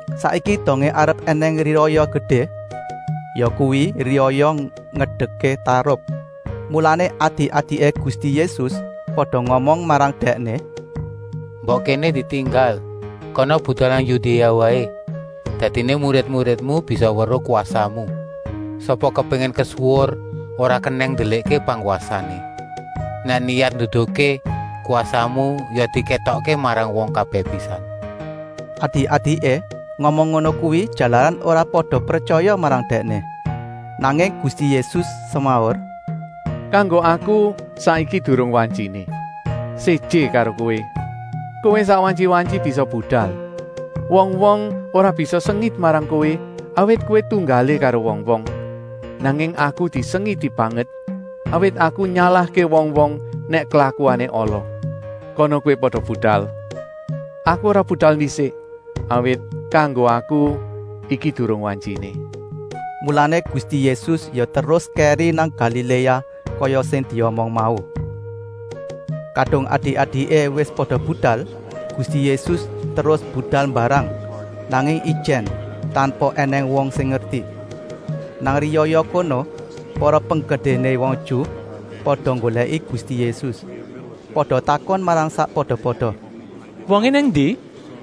Saiki dongé arep ènèng riyaya gedé, yakuwi riyaya Ngedekké Tarup. Mulané adik-adiké Gusti Yésus pada ngomong marang Dèkné: “Mbok kéné ditinggal. Kana budal nang Yudéa waé, dadiné murid-muridmu bisa weruh kwasamu. Sapa kepéngin kesuwur ora kenèng ndelikké pangwasané. Nèk niyat nduduhké kwasamu, ya dikétokké marang wong kabèh pisan.” Adik-adiké ngomong ngono kuwi, jalaran ora pada pretyaya marang Dèkné. Nanging Gusti Yésus semaur: “Kanggo Aku saiki durung wantyiné. Séjé karo kowé, kowé sak wantyi-wantyi bisa budal. Wong-wong ora bisa sengit marang kowé, awit kowé tunggalé karo wong-wong. Nanging Aku disengiti banget, awit Aku nyalahké wong-wong nèk klakuané ala. Kana kowé pada budal. Aku ora budal ndisik, awit kanggo Aku iki durung wantyiné.” Mulané Gusti Yésus ya terus kèri nang Galiléa kaya sing diomong mau. Kadung adik-adiké wis pada budal, Gusti Yésus terus budal mbarang, nanging ijèn, tanpa ènèng wong sing ngerti. Nang riyaya kono para penggedéné wong Ju pada nggolèki Gusti Yésus. Pada takon marang sakpada-pada: “Wongé nang endi?”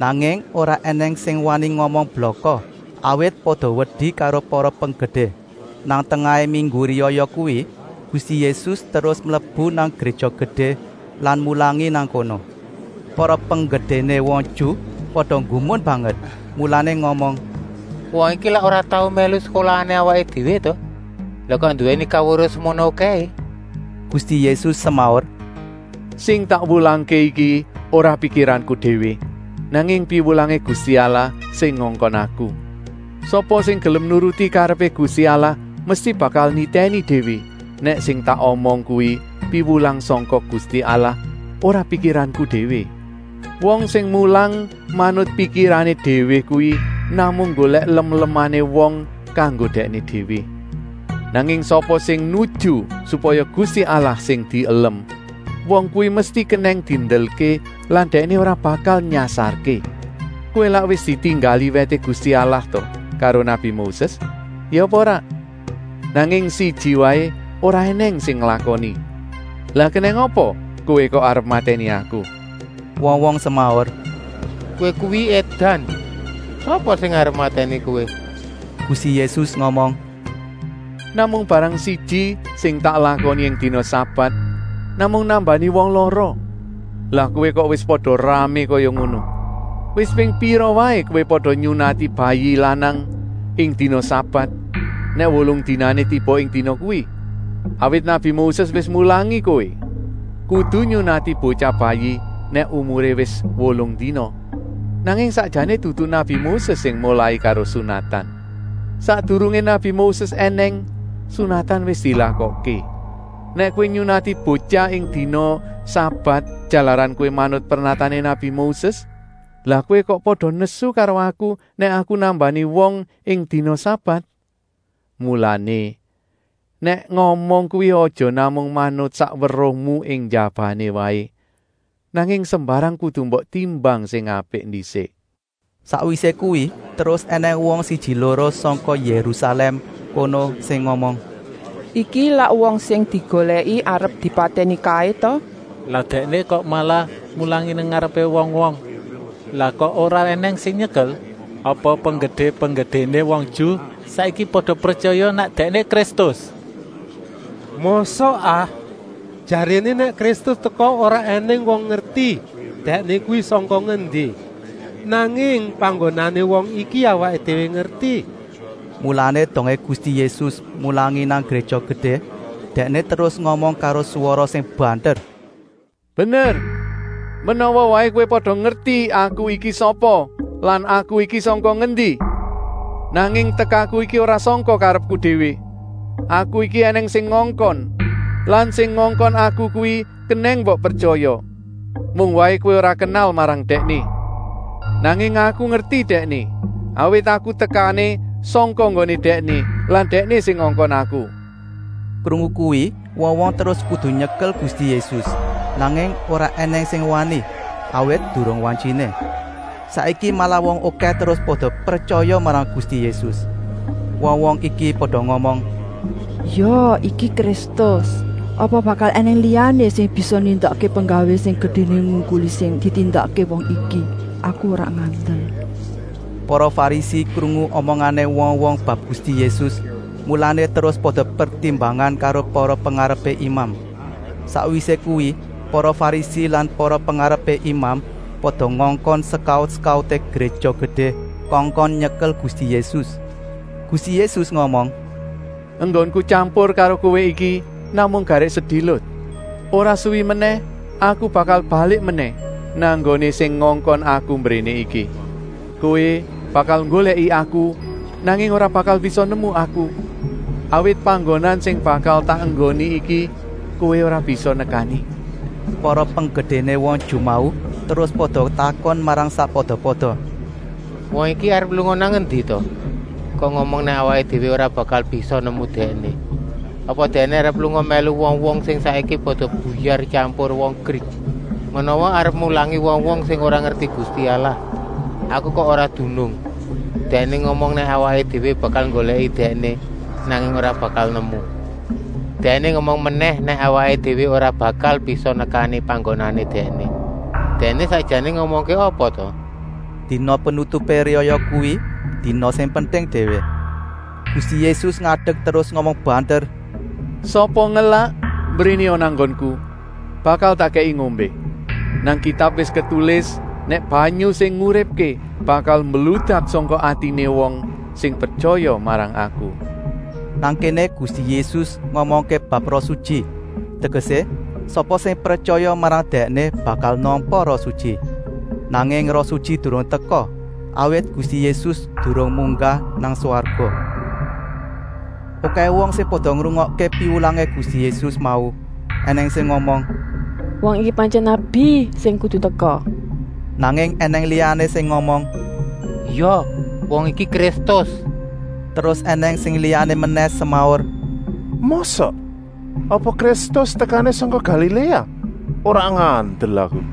Nanging ora ènèng sing wani ngomong blaka, awit pada wedi karo para penggedé. Nang tengahé minggu riyaya kuwi Gusti Yésus terus mlebu nang Gréja Gedé lan mulangi nang kono. Para penggedéné wong Ju pada nggumun banget, mulané ngomong: “Wong iki lak ora tau mèlu sekolahané awaké déwé ta? Lah kok nduwèni kaweruh semono okèhé?” Gusti Yésus semaur: “Sing tak wulangké iki ora pikiranku déwé, nanging piwulangé Gusti Allah sing ngongkon Aku. Sapa sing gelem nuruti karepé Gusti Allah mesti bakal nitèni déwé nèk sing tak omong kuwi piwulang sangka Gusti Allah, ora pikiranku déwé. Wong sing mulang manut pikirané déwé kuwi namung nggolèk lem-lemané wong kanggo dèkné déwé. Nanging sapa sing nuju supaya Gusti Allah sing dielem, wong kuwi mesti kenèng diendelké lan dèkné ora bakal nyasarké. Kowé lak wis ditinggali wèté Gusti Allah ta karo nabi Moses? Ya apa ora? Nanging siji waé ora ènèng sing nglakoni. Lah kenèng apa kowé kok arep matèni Aku?” Wong-wong semaur: “Kowé kuwi édan! Sapa sing arep matèni Kowé?” Gusti Yésus ngomong: “Namung barang siji sing tak lakoni ing dina sabat, namung nambani wong lara, lah kowé kok wis pada ramé kaya ngono! Wis ping pira waé kowé pada nyunati bayi lanang ing dina sabat nèk wolung dinané tiba ing dina kuwi. Awit nabi Moses wis mulangi kowé, kudu nyunati botyah bayi nèk umuré wis wolung dina. Nanging sakjané dudu nabi Moses sing molai karo sunatan. Sakdurungé nabi Moses ènèng, sunatan wis dilakokké. Nèk kowé nyunati botyah ing dina sabat jalaran kowé manut pernatané nabi Moses, lah kowé kok pada nesu karo Aku nèk Aku nambani wong ing dina sabat? Mulané, nèk ngomong kuwi aja namung manut sak weruhmu ing njabané waé, nanging sembarang kudu mbok timbang sing apik ndisik.” Sakwisé kuwi terus ènèng wong siji-loro sangka Yérusalèm kono sing ngomong: “Iki lak wong sing digolèki arep dipatèni kaé ta! Lah Dèkné kok malah mulangi nang ngarepé wong-wong. Lah kok ora ènèng sing nyekel? Apa penggedé-penggedéné wong Ju saiki pada pretyaya nèk Dèkné Kristus? Mosok ah? Jaréné nèk Kristus teka ora ènèng wong ngerti Dèkné kuwi sangka ngendi! Nanging panggonané wong iki awaké déwé ngerti!” Mulané dongé Gusti Yésus mulangi nang Gréja Gedé Dèkné terus ngomong karo swara sing banter: “Bener, menawa waé kowé pada ngerti Aku iki sapa lan Aku iki sangka ngendi. Nanging tekaku iki ora sangka karepku déwé! Aku iki ènèng sing ngongkon lan sing ngongkon Aku kuwi kenèng mbok pretyaya. Mung waé kowé ora kenal marang Dèkné. Nanging Aku ngerti Dèkné, awit Aku tekané sangka nggoné Dèkné lan Dèkné sing ngongkon Aku.” Krungu kuwi wong-wong terus kudu nyekel Gusti Yésus, nanging ora ènèng sing wani, awit durung wantyiné. Saiki malah wong okèh terus pada pretyaya marang Gusti Yésus. Wong-wong iki pada ngomong: “Ya iki Kristus. Apa bakal ènèng liyané sing bisa nindakké penggawé sing gedéné ngungkuli sing ditindakké wong iki. Aku ora ngandel!” Para Farisi krungu omongané wong-wong bab Gusti Yésus, mulané terus pada pertimbangan karo para pengarepé imam. Sakwisé kuwi para Farisi lan para pengarepé imam pada ngongkon sekaut-sekauté Gréja Gedé kongkon nyekel Gusti Yésus. Gusti Yésus ngomong: “Enggonku tyampur karo kowé iki namung garèk sedilut. Ora suwi menèh Aku bakal balik menèh nang nggoné sing ngongkon Aku mbréné iki. Kowé bakal nggolèki Aku, nanging ora bakal bisa nemu Aku, awit panggonan sing bakal tak enggoni iki kowé ora bisa nekani.” Para penggedéné wong Ju mau terus pada takon marang sakpada-pada: “Wong iki arep lunga nang endi ta kok ngomong nèk awaké déwé ora bakal bisa nemu Dèkné. Apa Dèkné arep lunga mèlu wong-wong sing saiki pada buyar tyampur wong Grik? Menawa arep mulangi wong-wong sing ora ngerti Gusti Allah? Aku kok ora dunung. Dèkné ngomong nèk awaké déwé bakal nggolèki Dèkné, nanging ora bakal nemu. Dèkné ngomong menèh nèk awaké déwé ora bakal bisa nekani panggonané Dèkné. Dèkné sakjané ngomongké apa ta?” Dina penutupé riyaya kuwi dina sing penting déwé. Gusti Yésus ngadek terus ngomong banter: “Sapa ngelak, mbrénéa nang nggonku, bakal tak kèki ngombé. Nang Kitab wis ketulis nèk banyu sing nguripké bakal mbludak sangka atiné wong sing pretyaya marang Aku!” Nang kéné Gusti Yésus ngomongké bab Roh Sutyi, tegesé, sapa sing pretyaya marang Dèkné bakal nampa Roh Sutyi. Nanging Roh Sutyi durung teka, awit Gusti Yésus durung munggah nang swarga. Okèh wong sing pada ngrungokké piwulangé Gusti Yésus mau. Enèng sing ngomong: “Wong iki pantyèn nabi sing kudu teka!” Nanging ènèng liyané sing ngomong: “Ya, wong iki Kristus!” Terus ènèng sing liyané menèh semaur: “Mosok? Apa Kristus tekané sangka Galiléa! Ora ngandel Aku?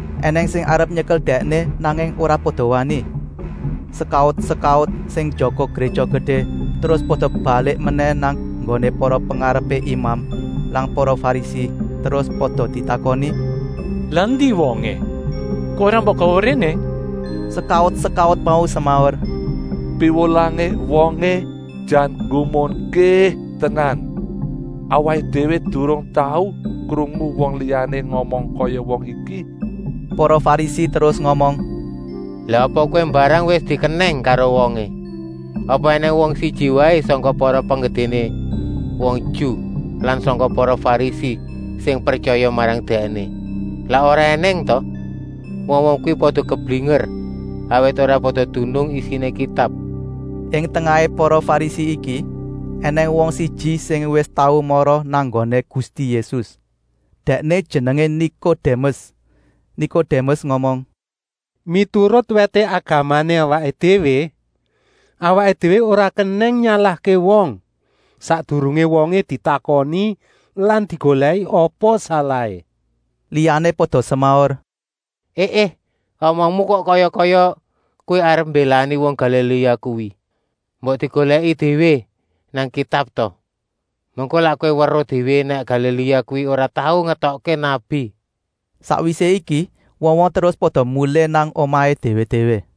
Enèng sing arep nyekel Dèkné, nanging ora pada wani. Sekaut-sekaut sing njaga Gréja Gedé terus pada balik menèh nang nggoné para pengarepé imam lan para Farisi, terus pada ditakoni: “Lah endi wongé? Kok ora mbok gawa mbréné?” Sekaut-sekaut mau semaur: “Piwulangé wongé jan nggumunké tenan. Awaké déwé durung tau krungu wong liyané ngomong kaya wong iki!” Para Farisi terus ngomong: “Lah apa kowé mbarang wis dikenèng karo wongé? Apa ènèng wong siji waé sangka para penggedéné wong Ju lan sangka para Farisi sing pretyaya marang Dèkné? Lak ora ènèng ta? Wong-wong kuwi pada keblinger, awit ora pada dunung isiné Kitab!” Ing tengahé para Farisi iki ènèng wong siji sing wis tau mara nang nggoné Gusti Yésus. Dèkné jenengé Nikodémes. Nikodémes ngomong: “Miturut wèté agamané awaké déwé, awaké déwé ora kenèng nyalahké wong, sakdurungé wongé ditakoni lan digolèki apa salahé?” Liyané pada semaur: “E, é, omongmu kok kaya-kaya kowé arep mbélani wong Galiléa kuwi. Mbok digolèki déwé nang Kitab ta, mengko lak kowé weruh déwé nèk Galiléa kuwi ora tau ngetokké nabi.” Sakwisé iki wong-wong terus pada mulih nang omahé déwé-déwé.